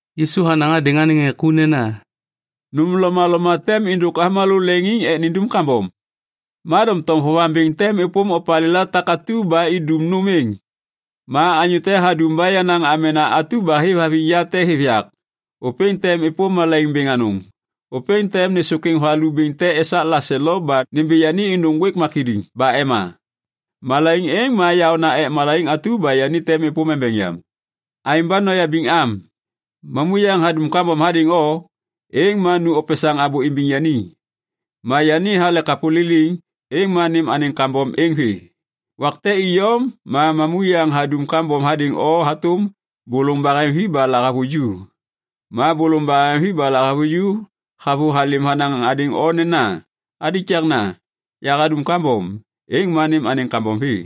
Yisu hanaŋ hadêŋ anêŋ ŋê ku nena, “Nôm lomaloma tem êndôk avômalô leŋiŋ ek nindum kambom. Ma doŋtom vovaŋ bêŋ tem êpôm opalêla takatu ba indum nôm êŋ. Ma anyô te hadum ba yenaŋ amena atu ba hêvhaviŋ ya te hêv yak, ôpêŋ tem êpôm malaiŋ bêŋ anôŋ. Ôpêŋ tem nêsôkwêŋ valu bêŋ te esak laselo ba nimbi yani êndôk ŋgwêk makidiŋ ba ema. Malaiŋ êŋ ma yaôna ek malaiŋ atu ba yani tem êpôm embeŋ yam. Aêŋ ba noyabiŋ am. “Mamuyaŋ hadum kambom hadêŋ o, êŋ ma nu opesaŋ abô imbiŋ yani. Ma yani hale kapô liliŋ, êŋ ma nêm anêŋ kambom êŋ vê. Wak te iyom ma mamuyaŋ hadum kambom hadêŋ o hatôm bôlôŋ baheŋvi ba lahavuju, ma bôlôŋ baheŋvi ba lahavuju havôhalêm hanaŋ hadêŋ o nena, ‘Alikakna, yahadum kambom’, êŋ ma nêm anêŋ kambom vê.”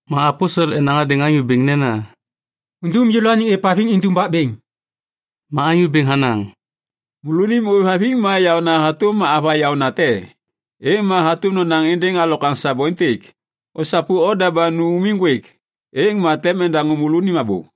Ma aposel enaŋ hadêŋ Anyô Bêŋ nena, “Undum yêlôaniŋ êvhaviŋ indumbak bêŋ!” Ma Anyô Bêŋ hanaŋ, “Môlônim ôêvhaviŋ ma yaôna hatôm ava yaônate, êŋ ma hatôm nonaŋ êndêŋ alokwaŋ sabo êntêk, ‘Osapu oda ba nu umiŋ ŋgwêk,’ êŋ ma tem endaŋô môlônim abô.”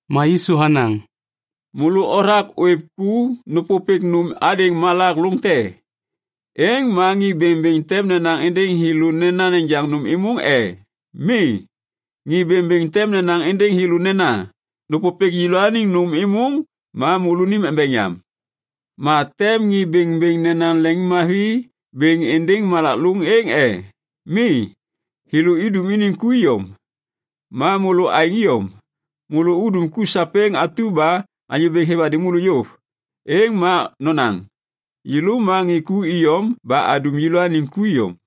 Ma Yisu hanaŋ, “Môlô othak ôêv ku nêpôpêk nôm hadêŋ malak lôŋ te. Êŋ ma ŋê bêŋbêŋ tem nenaŋ êndêŋ thêlô nena nejaŋ nôm êmôŋ e? Mi. Ŋê bêŋbêŋ tem nenaŋ êndêŋ thêlô nena, ‘Nôpôpêk yêlôaniŋ nôm êmôŋ ma môlônim embeŋ yam.’ Ma tem ŋê bêŋbêŋ nenaŋ leŋiŋmavi bêŋ êndêŋ malak lôŋ êŋ e? Mi, thêlô idum iniŋ ku iyom. Ma môlô aêŋ iyom, môlô udum ku sapêŋ atu ba Anyô Bêŋ hêv hadêŋ môlô yôv, êŋ ma nonaŋ, ‘Yêlô ma ŋê ku iyom ba adum yêlôaniŋ ku iyom.’”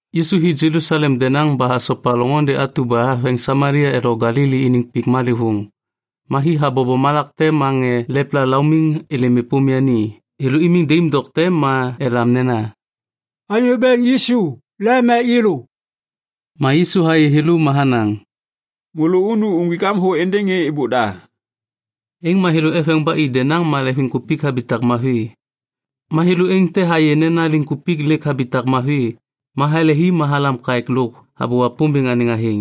Yisu hi Jelusalem denaŋ ba hasopa loŋôndê atu ba haveŋ Samalia lo Galili iniŋ pik malêvôŋ. Ma hi habobo malak te ma ŋê lepla laumiŋ êlêm êpôm yani. Thêlô imiŋ daim dokte ma elam nena, “Anyô Bêŋ Yisu, lem ek yêlô.” Ma Yisu hayê thêlô ma hanaŋ, “Môlô unu uŋgwik am thô êndêŋ ŋê êbôk da.” Êŋ ma thêlô eveŋ ba i denaŋ ma leŋviŋkupik habitak mavi. Ma thêlô êŋ te hayê nena liŋkupik lêk habitak mavi ma halehi ma halam kaêk lôk habô Wapômbêŋ anêŋ athêŋ.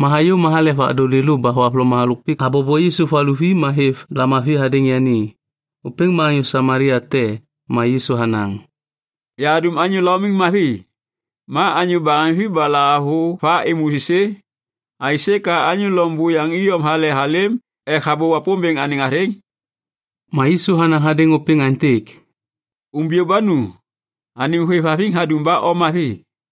Ma hayô ma halek vadôŋ lêlô ba thohavloma halôk pik habobo Yisu valuvi ma hêv lamavi hadêŋ yani. Ôpêŋ ma anyô Samalia te. Ma Yisu hanaŋ, “Yahadum anyô laumiŋ mavi. Ma anyô baheŋvi ba lahavuva êmô êsê? Aisê ka anyô loŋ buyaŋ iyom hale halêm ek habô Wapômbêŋ anêŋ athêŋ?” Ma Yisu hanaŋ hadêŋ ôpêŋ aêntêk, “Umbiyô ba nu, anêm hôêvhaviŋ hadum ba o mavi.”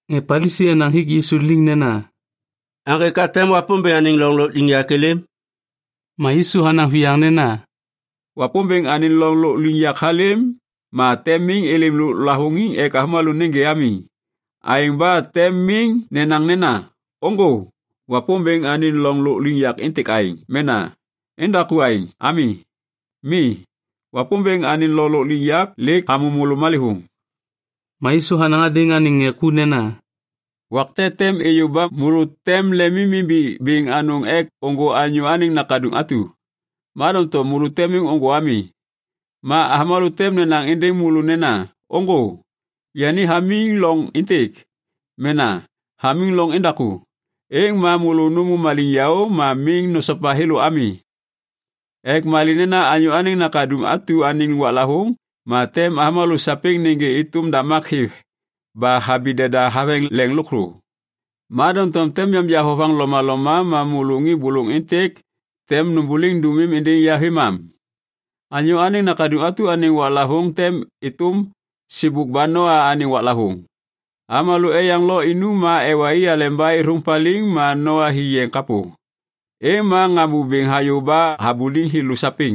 Ŋê Palisi enaŋ hik Yisu liŋ nena, “Aŋgê ka tem Wapômbêŋ anêŋ loŋ lôkliŋyak êlêm?” Ma Yisu hanaŋ viyaŋ nena, “Wapômbêŋ anêŋ loŋ lôkliŋyak halêm ma tem miŋ êlêm lôk lavôŋiŋ ek avômalô nêgê ami. Aêŋ ba tem miŋ nenaŋ nena, ‘Ôŋgô, Wapômbêŋ anêŋ loŋ lôkliŋyak êntêk aêŋ’ mena ‘Endaku aêŋ’ ami. Mi, Wapômbêŋ anêŋ loŋ lôkliŋyak lêk hamô môlô malêvôŋ.” Ma Yisu hanaŋ hadêŋ anêŋ ŋê ku nena, “Wak te tem êyô ba môlô tem lemimimbiŋ bêŋ anôŋ ek ôŋgô Anyô Anêŋ Nakaduŋ atu, ma doŋtom môlô tem miŋ ôŋgô ami. Ma avômalô tem nenaŋ êndêŋ môlô nena, ‘Ôŋgô, yani hamiŋ loŋ êntêk!’ mena ‘hamiŋ loŋ endaku!’ Êŋ ma môlô nômô maliŋyaô ma miŋ nosopa thêlô ami ek malê nena Anyô Anêŋ Nakaduŋ atu anêŋ waklavôŋ ma tem avômalô sapêŋ nêgê êtôm damak hêv ba habi deda haveŋ leŋ lôkthô. Ma doŋtom tem yanja vovaŋ lomaloma ma môlô ŋê bôlôŋ êntêk tem nômbôliŋ dômim êndêŋ ya vêmam. “Anyô Anêŋ Nakaduŋ atu anêŋ waklavôŋ tem êtôm sêbôk ba Noa anêŋ waklavôŋ. Avômalô eyaŋ lo inum ma ewa i aleba êthôŋ paliŋ ma Noa hi yeŋ kapô. Êŋ ma ŋambô bêŋ hayô ba habuliŋ thêlô sapêŋ.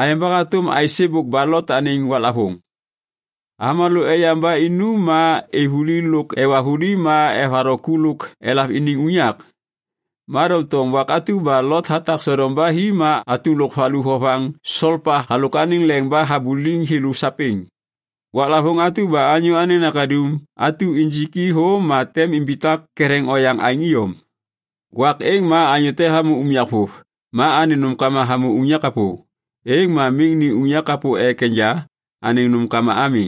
Aêŋ ba hatôm aêsêbôk ba Lot anêŋ waklavôŋ. Avômalô eyaŋ ba inum ma êv vuli lôk ewa vuli ma evatho ku lôk elav iniŋ unyak. Ma doŋtom wak atu ba Lot hatak Sodom ba hi ma atum lôk valu vovaŋ solpa halôk anêŋ leŋ ba habuliŋ thêlô sapêŋ. Waklavôŋ atu ba Anyô Anêŋ Nakaduŋ atu injik i thô ma tem imbitak ketheŋ oyaŋ aêŋ iyom. “Wak êŋ ma anyô te hamô unyak vôv ma anêŋ nômkama hamô unyak kapô, êŋ ma miŋ ni unyak kapô ek enja anêŋ nômkama ami.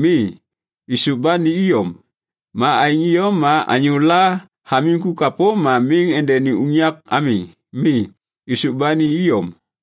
Mi, êsôv ba ni iyom. Ma aêŋ iyom ma anyôla hamiŋ ku kapô ma miŋ endeni unyak ami. Mi, êsôv ba ni iyom.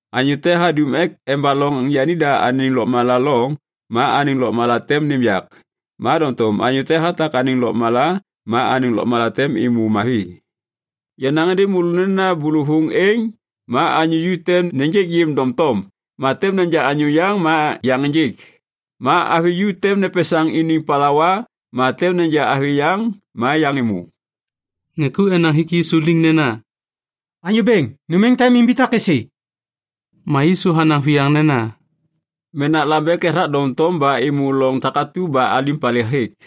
Anyô te hadum ek embaloŋ yanida anêŋ lôkmala loŋ ma anêŋ lôkmala tem nêm yak. Ma doŋtom anyô te hatak anêŋ lôkmala ma anêŋ lôkmala tem êmô mavi. “Yanaŋ êndêŋ môlô nena bôlôvôŋ êŋ ma anyô ju tem nêjêk yêm doŋtom ma tem neja anyô yaŋ ma yaŋ ênjêk. Ma avi ju tem nepesaŋ iniŋ palawa ma tem neja avi yaŋ ma yaŋ êmô.” Ŋê ku enaŋ hik Yisu liŋ nena, “Anyô Bêŋ, nôm êŋ tem imbitak êsê?” Ma Yisu hanaŋ viyaŋ nena, “Menak lambek ethak doŋtom ba êmô loŋ takatu ba alim hapalê hêk.”